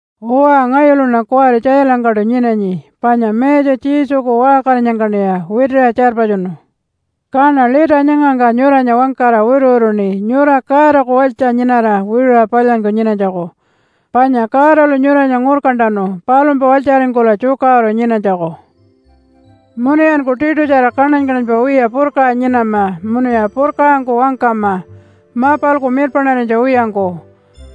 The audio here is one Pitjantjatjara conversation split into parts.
Uwa ngayuluṉa kuwari tjailangkaṯu nyinanyi panya Mayatja Jesuku waṟkarinyangkaṉiya witiṟa tjarpatjunu. Kaṉa lita nyangangka nyuranya wangkara wituwituṉi nyura Godaku walytja nyinara wiṟuṟa palyanyku nyinanytjaku. Panya Godalu nyuranya ngurkantanu palumpa walytjaringkula tjukaṟuru nyinanytjaku. Munuyanku tiṯutjara kaṉany-kaṉanypa wiya purkaṟa nyinama munuya purkaṟangku wangkama mapalku mirpaṉarinytja wiyangku,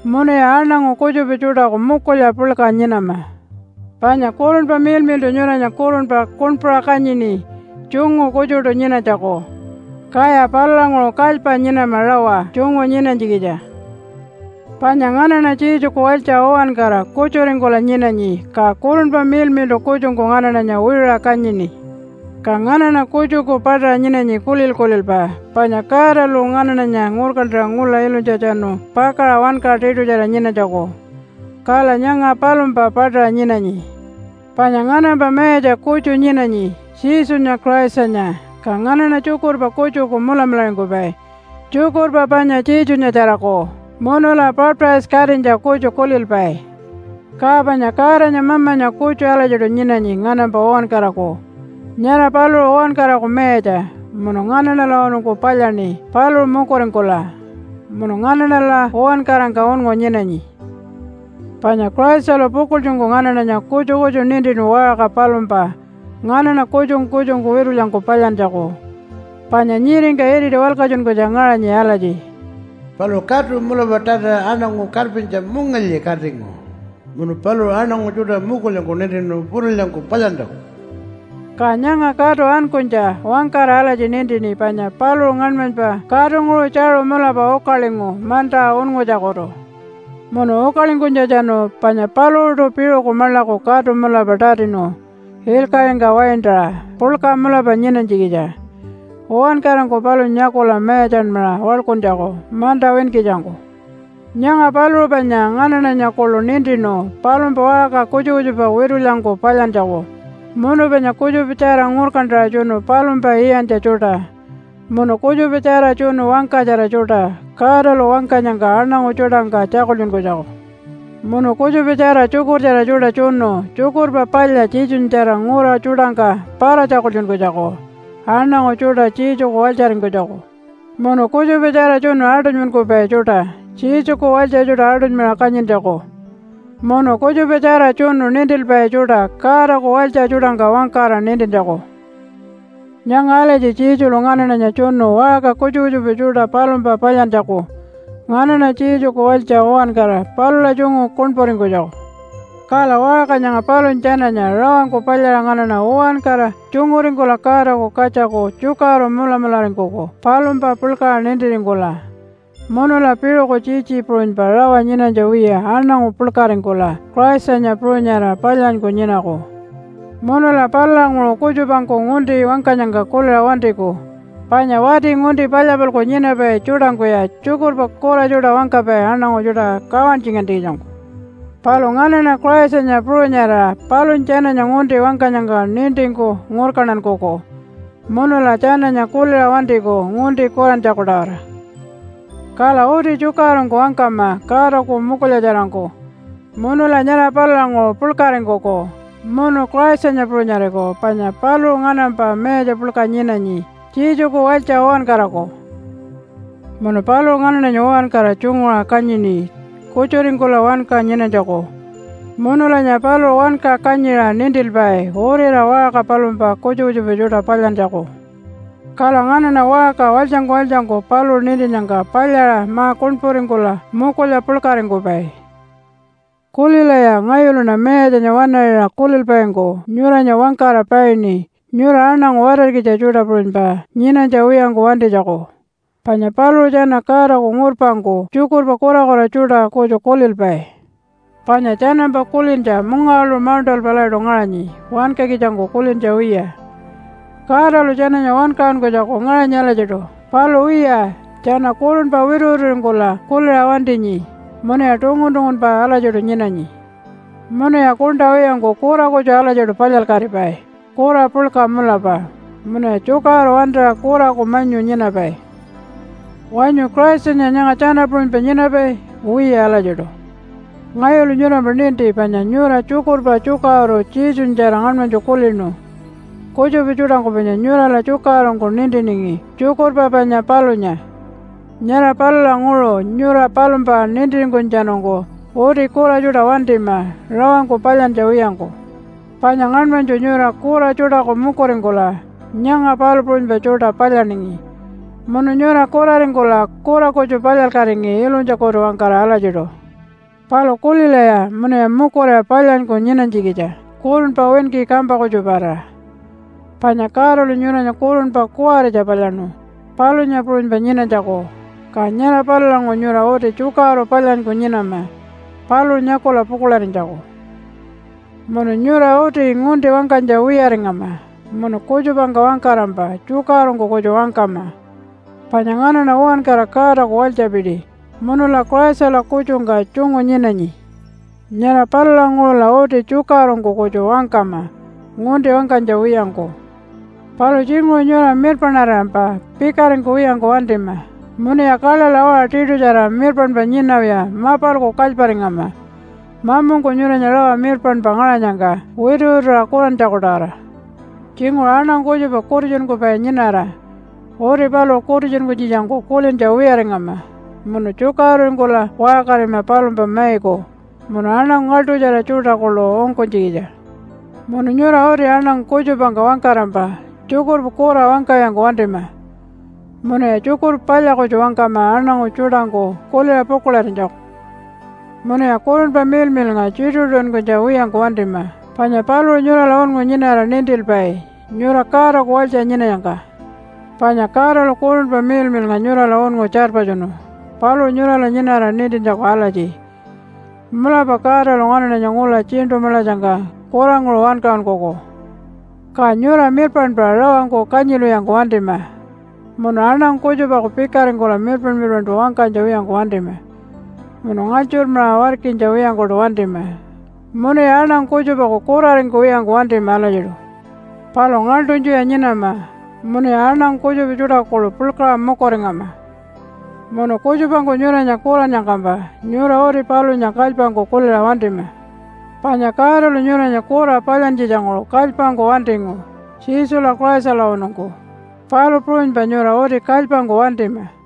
munuya aṉangu kutjupa tjuṯaku mukulya puḻka nyinama. Panya Kurunpa Miḻmiḻṯu nyuranya kurunpa kuṉpuṟa kanyini tjungu kutjuṯu nyinanytjaku. Kaya palulanguṟu kalypa nyinama rawa tjungu nyinanytjikitja. Panya nganaṉa Jesuku walytja uwankara kutjuringkula nyinanyi. Ka Kurunpa Miḻmiḻṯu kutjungku nganaṉanya wiṟuṟa kanyini. Ka nganaṉa kutjuku paṯaṟa nyinanyi kulil-kulilpa, panya Godalu nganaṉanya ngurkantanu ngula ilunytjatjanu pakaṟa wanka tiṯutjara nyinanytjaku, kala nyanga palumpa paṯaṟa nyinanyi. Panya nganampa Mayatja kutju nyinanyi, Jesunya Christanya. Ka nganaṉa tjukurpa kutjuku mulamularingkupai, tjukurpa panya Jesunyatjaraku. Munula baptise-katinytja kutju kulilpai. Ka panya Godanya Mamanya kutju alatjiṯu nyinanyi nganampa uwankaraku. Nyara paluṟu uwankaraku mayatja, munu nganaṉalawanungku palyaṉi paluṟu mukuringkula, munu nganaṉala uwankarangka unngu nyinanyi. Panya Christalu pukuḻtjungku nganaṉanya kutju kutju nintinu waṟka palumpa nganaṉa kutjungku kutjungku witulyangku palyantjaku. Panya nyiringka iriti walkatjunkunytja ngaṟanyi alatji, “Paluṟu katu mulapa tatiṟa aṉangu karpintja mungilyi katingu, munu paluṟu aṉangu tjuṯa mukulyangku nintinu witulyangku palyantjaku.” Ka nyanga katu ankunytja wangkara alatji nintini panya paluṟu ngaṉmanypa katunguṟu tjaṟu mulapa ukalingu manta unngutjakutu. Munu ukalingkunytjatjanu panya paluṟuṯu piṟuku maḻaku katu mulapa tatinu ilkaṟingka waintaṟa puḻka mulapa nyinanytjikitja uwankarangku palunya nyakula mayatjanmaṟa waḻkuntjaku manta winkitjangku. Nyanga paluṟu panya nganaṉanya kuḻu nintinu palumpa waṟka kutjupa kutjupa witulyangku palyantjaku, munu panya kutjupatjara ngurkantaṟa tjunu palumpa iyantja tjuṯa, munu kutjupatjara tjunu wangkatjara tjuṯa Godalu wangkanyangka aṉangu tjuṯangka tjakultjunkunytjaku, munu kutjupatjara tjukurtjara tjuṯa tjunu Tjukurpa Palya Jesunyatjara ngura tjuṯangka para-tjakultjunkunytjaku aṉangu tjuṯa Jesuku walytjaringkunytjaku, munu kutjupatjara tjunu aṯunymankupai tjuṯa Jesuku walytja tjuṯa aṯunymaṟa kanyintjaku, munu kutjupatjara tjunu nintilpai tjuṯa Godaku walytja tjuṯangka wangkara nintintjaku. Nyanga alatji Jesulu nganaṉanya tjunu waṟka kutjupa kutjupa tjuṯa palumpa palyantjaku nganaṉa Jesuku walytja uwankara palula tjungu kuṉpuringkunytjaku. Kala waṟka nyanga palunya tjananya rawangku palyaṟa nganaṉa uwankara tjunguringkula Godaku katjaku tjukaṟuru mulamularingkuku palumpa puḻkaṟa nintiringkula. Munula piṟuku tjitji puṟunypa rawa nyinanytja wiya aṉangu puḻkaringkula Christanya puṟunyarira palyanyku nyinaku. Munula palulanguṟu kutjupangku ngunti wangkanyangka kuliṟa wantiku. Panya wati ngunti palya-palku nyinapai tjuṯangkuya tjukurpa kura tjuṯa wangkapai aṉangu tjuṯa kawantjingantjikitjangku. Palu nganaṉa Christanya puṟunyarira palunya tjananya ngunti wangkanyangka nintingku ngurkantankuku munula tjananya kuliṟa wantiku ngunti kurantjaku-tawara. Kala uti tjukaṟurungku wangkama Godaku mukulyatjarangku munula nyara palulanguṟu puḻkaringkuku munu Christanya puṟunyariku panya paluṟu nganampa Mayatja puḻka nyinanyi, Jesuku walytja uwankaraku. Munu paluṟu nganaṉanya uwankara tjunguṟa kanyini kutjuringkula wanka nyinanytjaku. Munulanya paluṟu wanka kanyiṟa nintilpai uriṟa waṟka palumpa kutjupa kutjupa tjuṯa palyantjaku. Kala nganaṉa waṟka walytjangku walytjangku paluṟu nintinnyangka palyaṟa ma-kuṉpuringkula mukulya puḻkaringkupai. Kulilaya! Ngayuluṉa Mayatjanya waṉaṟiṟa kulilpaingku nyuranya wangkara paini nyura aṉangu watarkitja tjuṯa puṟunypa nyinanytja wiyangku wantinytjaku, panya paluṟu tjana Godaku ngurpangku tjukurpa kurakura tjuṯa kutju kulilpai. Panya tjanampa kulintja mungawaḻuṟu mauṉṯalpa alatjiṯu ngaṟanyi wankakitjangku kulintja wiya. Godalu tjananya wankaṟunkunytjaku ngaṟanyi alatjiṯu, palu wiya, tjana kurunpa wituwituringkula kuliṟa wantinyi munuya tungun-tungunpa alatjiṯu nyinanyi. Munuya kuṉṯa wiyangku kura kutju alatjiṯu palyalkatipai kura puḻka mulapa, munuya tjukaṟuru wantira kuraku manyu nyinapai. Wanyu Christanya nyanga tjana puṟunypa nyinapai? Wiya alatjiṯu. Ngayulu nyurampa ninti, panya nyura tjukurpa tjukaṟuru Jesunyatjara ngaṉmanytju kulinu. Kutjupa tjuṯangku panya nyurala tjukaṟurungku nintiningi tjukurpa panya palunya. Nyara palulanguṟu nyura palumpa nintiringkunytjatjanungku uti kura tjuṯa wantima rawangku palyantja wiyangku. Panya ngaṉmanytju nyura kura tjuṯaku mukuringkula nyanga palu puṟunypa tjuṯa palyaningi, munu nyura kuraringkula kura kutju palyalkatingi ilunytjakutu-wangkara alatjiṯu. Palu kulilaya munuya mukuriwa palyanyku nyinanytjikitja kurunpa winki kampa kutjuparira. Panya Godalu nyuranya kurunpa kuwaritja palyaṉu palunya puṟunypa nyinanytjaku, ka nyara palulanguṟu nyura uti tjukaṟuru palyanyku nyinama paluṟu nyakula pukuḻarinytjaku. Munu nyura uti ngunti wangkanytja wiyaringama munu kutjupangka wangkarampa tjukaṟurungku kutju wangkama, panya nganaṉa uwankara Godaku walytjapiti munula Christala kutjungka tjungu nyinanyi. Nyara palulanguṟula uti tjukaṟurungku kutju wangkama ngunti wangkanytja wiyangku. Palu tjinguṟu nyura mirpaṉarirampa pikaringkuwiyangku wantima. Munuya kaḻaḻa waṟa tiṯutjara mirpaṉpa nyinawiya mapalku kalyparingama mamungku nyuranya rawa mirpaṉpa ngaṟanyangka wituwituṟa kurantjaku-tawara. Tjinguṟu aṉangu kutjupa kutitjunkupai nyinara, uti paluṟu kutitjunkunytjikitjangku kulintja wiyaringama munu tjukaṟururingkula waṟkarima palumpa maiku munu aṉangu ngaḻṯutjara tjuṯa kuḻu ungkunytjikitja. Munu nyura uti aṉangu kutjupangka wangkarampa tjukurpa kura wangkawiyangku wantima. Munuya tjukurpa palya kutju wangkama aṉangu tjuṯangku kuliṟa pukuḻarinytjaku. Munuya Kurunpa Miḻmiḻnga tjituṟu-tjituṟunkunytja wiyangku wantima, panya paluṟu nyurala unngu nyinara nintilpai nyura Godaku walytja nyinanyangka. Panya Godalu Kurunpa Miḻmiḻnga nyurala unngu tjarpatjunu paluṟu nyurala nyinara nintintjaku alatji, “Mulapa Godalu nganaṉanya ngula Tjiṉṯu Maḻatjangka kuranguṟu wankaṟunkuku.” Ka nyura mirpaṉpa rawangku kanyilwiyangku wantima, munu aṉangu kutjupaku pikaringkula mirpaṉ-mirpaṉṯu wangkanytja wiyangku wantima, munu ngalytjurmaṟa warkinytja wiyangkuṯu wantima, munuya aṉangu kutjupaku kuraringkuwiyangku wantima alatjiṯu. Palu ngaḻṯunytjuya nyinama, munuya aṉangu kutjupa tjuṯaku kuḻu puḻkaṟa mukuringama. Munu kutjupangku nyuranya kurannyangkampa nyura uti palunya kalypangku kuliṟa wantima. Panya Godalu nyuranya kura palyantjitjanguṟu kalypangku wantingu Jesula Christalawanungku, palu puṟunypa nyura uti kalypangku wantima.